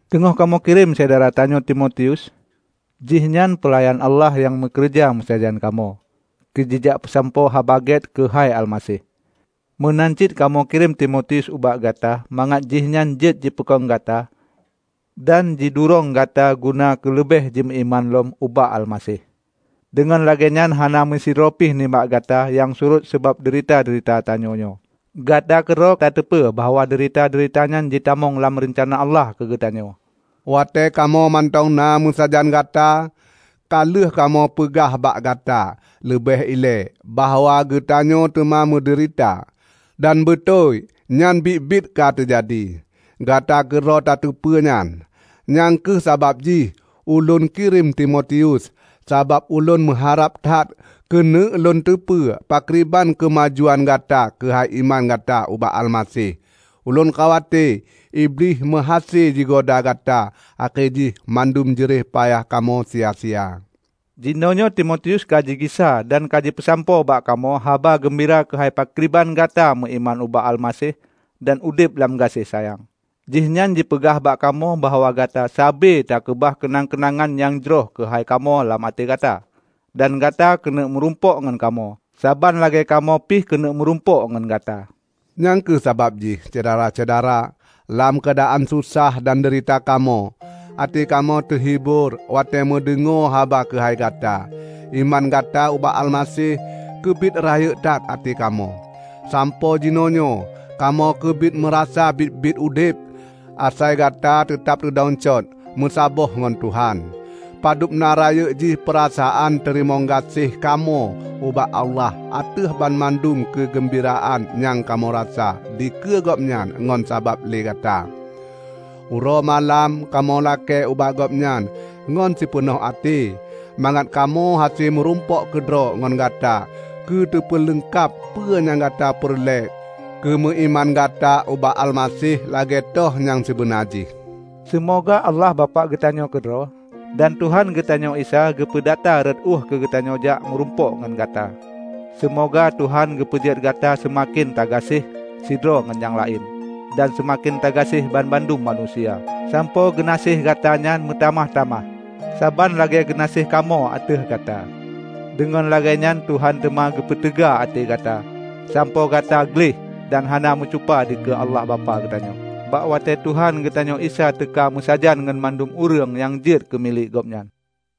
teungoh kamoe kirém syedara tanyoe Timotius. Jihnyan peulayan Allah nyang meukeureuja meusajan kamoe keu jijak peusampoe Haba Gét keuhai Almaseh. Meunan cit kamoe kirém Timotius ubak gata mangat jihnyan jeuet jipeukong gata dan jidurong gata guna keuleubeh jimeuiman lom ubak Almaseh. Deungon lagée nyan hana meusidroe pi nibak gata nyang surot sabab deurita-deurita tanyoe nyoe. Gata keudroe tateupeue bahwa deurita-deurita nyan jitamong lam reuncana Allah keugeutanyoe. Watée kamoe mantong na meusajan gata, ka lheueh kamoe peugah bak gata leubeh ilée bahwa geutanyoe teuma meudeurita. Dan beutôi nyan biet-biet ka teujadi; gata keudroe tateupeue nyan. Nyang kheueh sabab jih ulôn kirém Timotius, sabab ulôn meuharab that keuneuk lôn teupeue pakriban keumajuan gata keuhai iman gata ubak Almaseh. Ulôn khawate Iblih meuhase jigoda gata akhé jih mandum jeureh payah kamoe sia-sia. Jinoenyoe Timotius ka jigisa dan ka jipeusampoe bak kamoe haba geumbira keuhai pakriban gata meuiman ubak Almaseh dan udeb lam gaséh sayang. Jihnyan jipeugah bak kamoe bahwa gata sabe takeubah keunang-keunangan nyang jroh keuhai kamoe lam até gata. Dan gata keuneuk meurumpok ngon kamoe, saban lagée kamoe pi keuneuk meurumpok ngon gata. Nyang kheueh sabab jih, Syedara-syedara, lam keuadaan susah dan deurita kamoe, até kamoe teuhibor watée meudeungoe haba keuhai gata. Iman gata ubak Almaseh keubiet rayeuk that até kamoe, sampoe jinoenyoe kamoe keubiet meurasa biet-biet udeb, asai gata teutab teudong cot, meusaboh ngon Tuhan. Padubna rayeuk jih peurasaan teurimong gaséh kamoe ubak Allah ateueh banmandum keugeumbiraan nyang kamoe rasa dikeue Gobnyan ngon sabab lé gata. Uroe malam kamoe lakée bak Gobnyan ngon sipeunoh até, mangat kamoe hase meurumpok keudroe ngon gata keu teupeuleungkab peue nyang gata peureulée keumeuiman gata ubak Almaseh lagée toh nyang sibeuna jih. Seumoga Allah Bapak geutanyoe keudroe, dan Tuhan geutanyoe Isa geupeudata rot ueh keukamoe jak meurumpok ngon gata! Seumoga Tuhan geupeujeuet gata seumaken tagaséh sidroe ngon nyang laén dan seumaken tagaséh banmandum manusia, sampoe geunaséh gata nyan meutamah-tamah, saban lagée geunaséh kamoe ateueh gata. Deungon lagée nyan Tuhan teuma geupeuteuga até gata, sampoe gata gleh dan hana meucupa dikeue Allah Bapak geutanyoe, bak watée Tuhan geutanyoe Isa teuka meusajan ngon mandum ureuëng nyang jeuet keu milék Gobnyan.